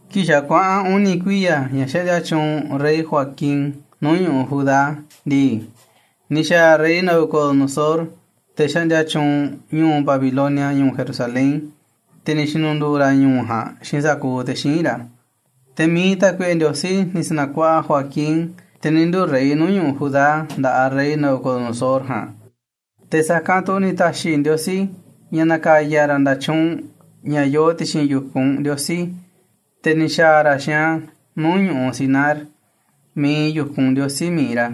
Kii̱ꞌ xa̱ kuaꞌa̱n uni̱ kuiya̱ ña̱ xaꞌndia tyuunꞌ rey Joaquin nuuꞌ ñu̱ꞌuꞌ Judá ndii, ni̱ xa̱a̱ rey Nabucodonosor, te̱ xaꞌndia tyuunꞌ ñu̱u̱ Babilonia, ñu̱u̱ Jerusalén, te̱ ni̱ xi̱nu̱ndu̱u̱ ra̱ ñu̱u̱ ja̱a̱nꞌ xiinꞌ sa̱kuuꞌ te̱ xíinꞌ ra̱. Te̱ mi̱iꞌ tákuiꞌe Ndiosí ni̱ sa̱na̱kuaꞌa Joaquin, te̱ ni̱ nduu̱ rey nuu̱ꞌ ñu̱ꞌuꞌ Judá, nda̱ꞌaꞌ rey Nabucodonosor ja̱a̱nꞌ. Te̱ sa̱kanꞌ tu̱ ni̱ ta̱xi̱ Ndiosí ña̱ na̱ka̱ya̱ ra̱ nda̱tyuunꞌ, ña̱ yoo ti̱xi̱n yu̱kunꞌ Ndiosí, te̱ ni̱ xa̱a̱ ra̱ xiinꞌ a̱ nuu̱ꞌ ñu̱ꞌuꞌ Sinar miiꞌ iinꞌ yu̱kunꞌ ndiosí mi̱iꞌ ra̱.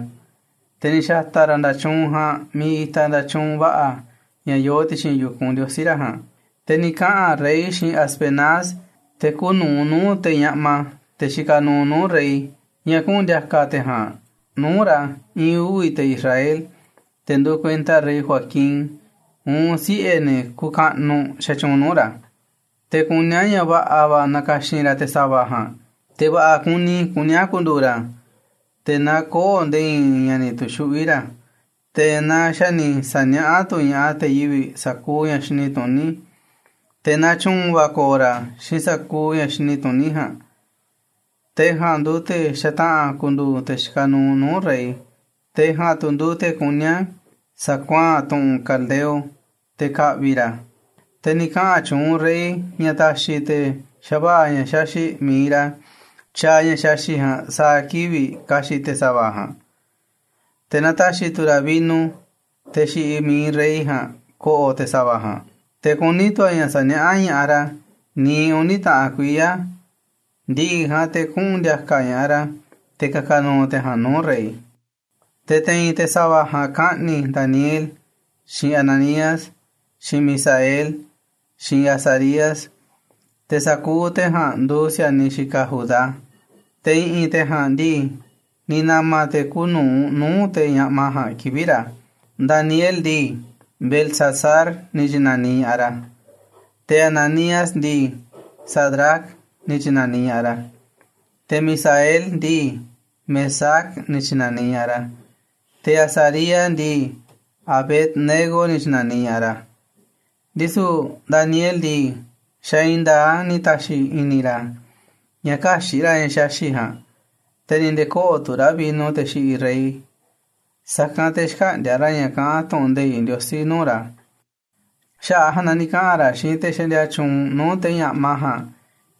Te̱ ni̱ xa̱ta̱ ra̱ nda̱tyuunꞌ ja̱a̱nꞌ miiꞌ itaꞌ nda̱tyuunꞌ va̱ꞌa̱ ña̱ yoo ti̱xi̱n yu̱kunꞌ ndiosí ra̱ ja̱a̱nꞌ. Te̱ ni̱ kaꞌa̱n rey xiinꞌ Aspenaz, te̱ kuuꞌ nu̱uꞌ nuu̱ꞌ te̱ ñaꞌma, te̱ xikaꞌ nuuꞌ nuu̱ꞌ rey, ña̱ kuꞌu̱n ndi̱a̱ka̱ te̱ ja̱a̱nꞌ nuu̱ꞌ ra̱ i̱i̱n uvi̱ te̱ Israel, te̱ nduuꞌ kuenta rey Joaquin, uun siꞌe̱ ne̱ kuuꞌ kaꞌnuꞌ xatyuunꞌ nuu̱ꞌ ra̱. Te̱ kuní a̱ ña̱ va̱ꞌa̱ va̱ na̱ka̱xi̱n ra̱ te̱ sa̱va̱ ja̱a̱nꞌ, te̱ va̱ꞌa̱ kuni kuní a̱ ku̱ndu̱u̱ ra̱, te̱ na kö̱o̱ nde̱e̱ i̱i̱n ña̱ ni̱ tu̱xuꞌví ra̱, te̱ na xa̱ ni̱ sa̱niaꞌá tu̱ ña̱ꞌaꞌ te̱ yivi̱ꞌ sa̱kuuꞌ ña̱ xini tuní, te̱ na tyu̱u̱n va̱ ko̱o̱ ra̱ xiinꞌ sa̱kuuꞌ ña̱ xini tuní ja̱a̱nꞌ, te̱ ja̱a̱nꞌ nduuꞌ te̱ xataꞌa̱n ku̱ndu̱u̱ te̱ xikaꞌ nuuꞌ nuu̱ꞌ rey. Te̱ ja̱a̱nꞌ tu̱ nduuꞌ te̱ kuní a̱ sa̱kuaa̱n tu̱ꞌu̱n te̱ Caldeo, te̱ ka̱ꞌvi̱ ra̱ a̱. Te̱ ni̱ kaꞌa̱n tyuunꞌ rey ña̱ ta̱xi̱ te̱ xava̱ꞌa̱ ña̱ xaxi̱ꞌ mi̱iꞌ ra̱ tyaaꞌ ña̱ xaxi̱ꞌ ja̱a̱nꞌ sa̱a̱ kivi̱ꞌ ka̱xi̱ꞌ te̱ sa̱va̱ ja̱a̱nꞌ, te̱ na ta̱xi̱ tu̱ ra̱ vino teꞌ xiꞌiꞌ mi̱iꞌ rey ja̱a̱nꞌ ko̱ꞌo̱ te̱ sa̱va̱ ja̱a̱nꞌ. Te̱ kuní tu̱ a̱ ña̱ sa̱niaꞌá ña̱ꞌaꞌ ra̱ niiꞌ uni̱ taꞌan kuiya̱, ndi̱ꞌi̱ ja̱a̱nꞌ te̱ kuꞌu̱n ndi̱a̱ka̱ ña̱ꞌaꞌ ra̱ te̱ ka̱ka̱ nu̱u̱ te̱ ja̱a̱nꞌ nuu̱ꞌ rey. Te̱ te̱i̱n te̱ sa̱va̱ ja̱a̱nꞌ kaꞌni̱ Daniel, xiinꞌ Ananías, xiinꞌ Misael, xiinꞌ Azarías, te̱ sa̱kuuꞌ te̱ ja̱a̱nꞌ nduuꞌ si̱a̱niꞌ xikaꞌ Judá. Te̱ i̱ꞌi̱n te̱ ja̱a̱nꞌ ndii, ni̱ na̱ma̱ te̱ kuuꞌ nu̱uꞌ nuu̱ꞌ te̱ ñaꞌma ja̱a̱nꞌ kivi̱ꞌ ra̱: Daniel ndii, Beltsasar ni̱ tyi̱na̱niꞌ ña̱ꞌaꞌ ra̱, te̱ Ananías ndii, Sadrac ni̱ tyi̱na̱niꞌ ña̱ꞌaꞌ ra̱, te̱ Misael ndii, Mesac ni̱ tyi̱na̱niꞌ ña̱ꞌaꞌ ra̱, te̱ Azarías ndii, Abed-nego ni̱ tyi̱na̱niꞌ ña̱ꞌaꞌ ra̱. Ndisu̱ Daniel ndii, xa̱ i̱i̱n nda̱a̱ꞌ a̱ ni̱ ta̱xi̱ i̱ni̱ ra̱ ña̱ kä̱xi̱ꞌ ra̱ ña̱ xaxi̱ꞌ ja̱a̱nꞌ, te̱ ni̱ nde̱e̱ kö̱ꞌo̱ tu̱ ra̱ vino teꞌ xiꞌiꞌ rey, sa̱kanꞌ te̱ xkäꞌndi̱a̱ ra̱ ña̱ kaꞌán tu̱ꞌu̱n nde̱iꞌ Ndiosí nuu̱ꞌ ra̱. Xaꞌa̱ꞌ a̱ ja̱a̱nꞌ na ni̱ kaꞌa̱n ra̱ xiinꞌ te̱ xaꞌndia tyuunꞌ nuu̱ꞌ te̱ ñaꞌma ja̱a̱nꞌ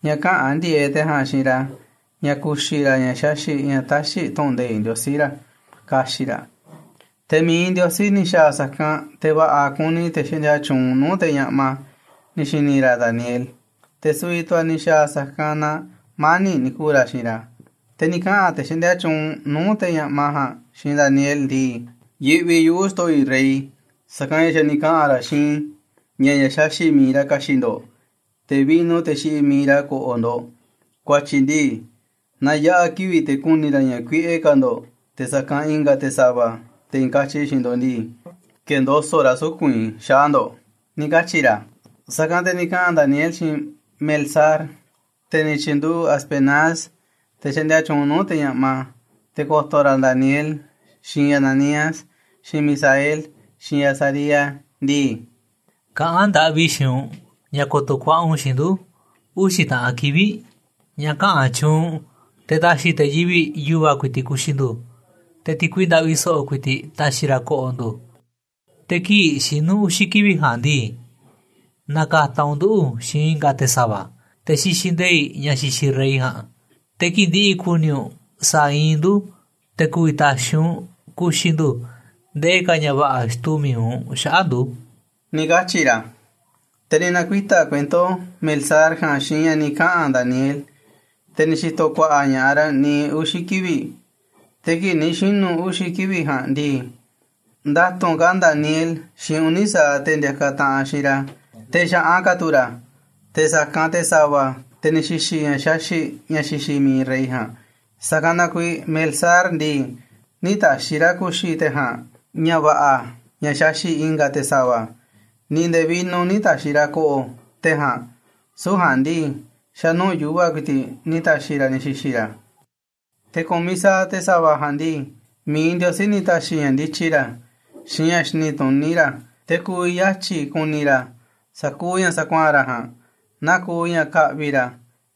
ña̱ käꞌa̱n ndi̱e̱eꞌ te̱ ja̱a̱nꞌ xiinꞌ ra̱ ña̱ ku̱xi̱ ra̱ ña̱ xaxi̱ꞌ, ña̱ täxiꞌ tu̱ꞌu̱n nde̱iꞌ Ndiosí ra̱, ka̱xi̱ꞌ ra̱. Te̱ mi̱iꞌ Ndiosí ni̱ xa̱a̱ sa̱kanꞌ, te̱ va̱ꞌa̱ kuni te̱ xaꞌndia tyuunꞌ nuu̱ꞌ te̱ ñaꞌma ni̱ xi̱ni̱ ra̱ Daniel, te̱ su̱vi̱ tu̱ a̱ ni̱ xa̱a̱ sa̱kanꞌ na mani̱ꞌ ni̱ ku̱u̱ ra̱ xiinꞌ ra̱. Te̱ ni̱ kaꞌa̱n te̱ xaꞌndia tyuunꞌ nuu̱ꞌ te̱ ñaꞌma ja̱a̱nꞌ xiinꞌ Daniel ndii: ―Yiꞌvi yuꞌu̱ xto̱ꞌo̱ i̱ rey, sa̱kanꞌ ña̱ xa̱ ni̱ kaꞌa̱n ra̱ xiinꞌ i̱ ña̱ ña̱ xaxi̱ꞌ mi̱iꞌ ra̱ ka̱xi̱ꞌ ndo̱ꞌ, te̱ vino teꞌ xiꞌiꞌ mi̱iꞌ ra̱ ko̱ꞌo̱ ndo̱ꞌ. Ku̱a̱tyi̱ ndii, naaꞌ yaꞌa̱ kivi̱ꞌ te̱ ku̱ni̱ ra̱ ña̱ kuiꞌe ka̱ ndo̱ꞌ te̱ sa̱kanꞌ i̱nga̱ te̱ sa̱va̱, te̱ i̱i̱n katyi xiinꞌ ndo̱ꞌ ndii, ke̱ndoso̱ꞌ ra̱ suku̱nꞌ i̱ xaꞌa̱ꞌ ndo̱ꞌ ―ni̱ katyi̱ ra̱. Sa̱kanꞌ te̱ ni̱ kaꞌa̱n Daniel xiinꞌ Melsar, te̱ ni̱ tyi̱nduꞌu̱ꞌ Aspenaz, te̱ xaꞌndia tyuunꞌ nuu̱ꞌ te̱ ñaꞌma, te̱ ko̱to̱ ra̱ Daniel, xiinꞌ Ananías, xiinꞌ Misael, xiinꞌ Azarías ndii: ―Kaꞌán ndaꞌvi i̱ xiinꞌ u̱nꞌ ña̱ ko̱to̱ ku̱a̱ꞌa̱ u̱nꞌ xiinꞌ ndu̱ uxi̱ taꞌan kivi̱ꞌ, ña̱ kaꞌa̱n tyuunꞌ u̱nꞌ te̱ ta̱xi̱ te̱ yivi̱ꞌ yu̱va̱ ku̱i̱ti̱ꞌ ku̱xi̱ ndu̱, te̱ ti̱kui ndaꞌvi so̱ꞌo̱ ku̱i̱ti̱ꞌ ta̱xi̱ ra̱ ko̱ꞌo̱ ndu̱. Te̱ kii̱ꞌ xinu̱ uxi̱ kivi̱ꞌ ja̱a̱nꞌ ndii, na̱ka̱ta̱ u̱nꞌ nduꞌu̱ xiinꞌ i̱nga̱ te̱ sa̱va̱, te̱ xixiꞌ nde̱i̱ꞌ ña̱ xixiꞌ rey ja̱a̱nꞌ. Te̱ kii̱ꞌ ndi̱ꞌi̱ ku̱ni̱ u̱nꞌ sa̱a̱ iinꞌ ndu̱ te̱ ku̱vi̱ ta̱xi̱ u̱nꞌ ku̱xi̱ ndu̱ ndee ka̱ ña̱ va̱ꞌa̱ xtuu mi̱iꞌ u̱nꞌ xaꞌa̱ꞌ ndu̱ ―ni̱ katyi̱ ra̱. Te̱ ni̱ na̱kuita̱ kuento Melsar ja̱a̱nꞌ xiinꞌ ña̱ ni̱ kaꞌa̱n Daniel, te̱ ni̱ xi̱to̱ ku̱a̱ꞌa̱ ña̱ꞌaꞌ ra̱ niiꞌ uxi̱ kivi̱ꞌ. Te̱ kii̱ꞌ ni̱ xinu̱ uxi̱ kivi̱ꞌ ja̱a̱nꞌ ndii, nda̱tu̱nꞌ ka̱ Daniel xiinꞌ uni̱ sa̱aꞌ te̱ ndiakaꞌ taꞌanꞌ xiinꞌ ra̱, te̱ xa̱ꞌan ka̱ tu̱ ra̱ te̱ sa̱kanꞌ te̱ sa̱va̱, te̱ ni̱ xi̱xi̱ ña̱ xaxi̱ꞌ ña̱ xixiꞌ mi̱iꞌ rey ja̱a̱nꞌ. Sa̱kanꞌ na kuiiꞌ Melsar ndii, nï̱ ta̱xi̱ ra̱ ku̱xi̱ te̱ ja̱a̱nꞌ ña̱ va̱ꞌa̱ ña̱ xaxi̱ꞌ i̱nga̱ te̱ sa̱va̱, ni̱ nde̱e̱ vino nï̱ ta̱xi̱ ra̱ ko̱ꞌo̱ te̱ ja̱a̱nꞌ, süu̱ꞌ ja̱a̱nꞌ ndii, xa̱nuu̱ꞌ yu̱va̱ ku̱i̱ti̱ꞌ ni̱ ta̱xi̱ ra̱ ni̱ xi̱xi̱ ra̱. Te̱ ku̱miꞌ sa̱aꞌ te̱ sa̱va̱ ja̱a̱nꞌ ndii, mi̱iꞌ Ndiosí ni̱ ta̱xi̱ ña̱ ndityi ra̱, xiinꞌ ña̱ xini tuní ra̱, te̱ ku̱vi̱ yatyi̱ ku̱ni̱ ra̱ sa̱kuuꞌ ña̱ sa̱kuaa̱n ra̱ ja̱a̱nꞌ, naa kuuꞌ ña̱ ka̱ꞌvi̱ ra̱,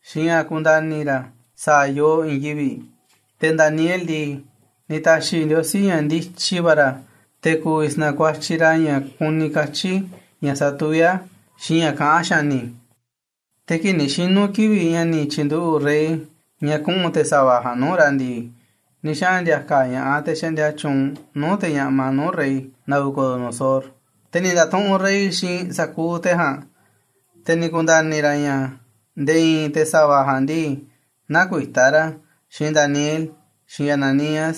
xiinꞌ ña̱ ku̱nda̱ni̱ ra̱ sa̱a̱ yoo i̱i̱n yivi̱ꞌ. Te̱ Daniel ndii, ni̱ ta̱xi̱ Ndiosí ña̱ ndityi va̱ ra̱, te̱ ku̱vi̱ sa̱na̱kuatyiꞌ ra̱ ña̱ kuni katyi̱ ña̱ satuví a̱ xiinꞌ ña̱ kaꞌán xa̱ni̱. Te̱ kii̱ꞌ ni̱ xinu̱ kivi̱ꞌ ña̱ ni̱ tyi̱nduꞌu̱ꞌ rey ña̱ kuꞌu̱n te̱ sa̱va̱ ja̱a̱nꞌ nuu̱ꞌ ra̱ ndii, ni̱ xaꞌa̱n ndi̱a̱ka̱ ña̱ꞌaꞌ te̱ xaꞌndia tyuunꞌ nuu̱ꞌ te̱ ñaꞌma nuu̱ꞌ rey Nabucodonosor. Te̱ ni̱ nda̱tuꞌunꞌ rey xiinꞌ sa̱kuuꞌ te̱ ja̱a̱nꞌ, te̱ ni̱ ku̱nda̱ni̱ ra̱ ña̱ nde̱e̱ i̱i̱n te̱ sa̱va̱ ja̱a̱nꞌ ndii, näkuitá ra̱ xiinꞌ Daniel, xiinꞌ Ananías,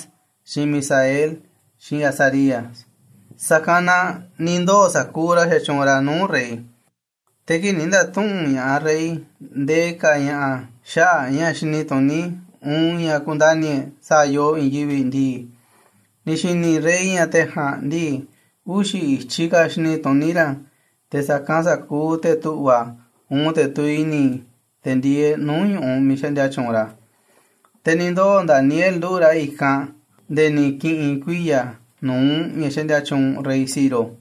xiinꞌ Misael, xiinꞌ Azarías. Sa̱kanꞌ na ni̱ ndoo̱ sa̱kuuꞌ ra̱ xatyuunꞌ ra̱ nuu̱ꞌ rey. Te̱ kii̱ꞌ ni̱ nda̱tuꞌu̱nꞌ ña̱ꞌaꞌ rey ndee ka̱ ña̱ꞌa̱ xaꞌa̱ꞌ ña̱ xini tuní, uun ña̱ kundani̱ e̱ꞌ sa̱a̱ yoo i̱i̱n yivi̱ꞌ ndii, ni̱ xi̱ni̱ rey ña̱ te̱ ja̱a̱nꞌ ndii, uxi̱ i̱tyiꞌ ka̱ xini tuní ra̱ te̱ sa̱kanꞌ sa̱kuuꞌ te̱ tu̱ꞌva̱, uun te̱ tuviꞌ i̱ni̱, te̱ ndieeꞌ nuu̱ꞌ ñu̱ꞌuꞌ miiꞌ xaꞌndia tyuunꞌ ra̱. Te̱ ni̱ ndoo̱ Daniel nduꞌu̱ꞌ ra̱ i̱kanꞌ nde̱e̱ ni̱ ki̱ꞌi̱n kuiya̱ nu̱uꞌ ña̱ xaꞌndia tyuunꞌ rey Ciro.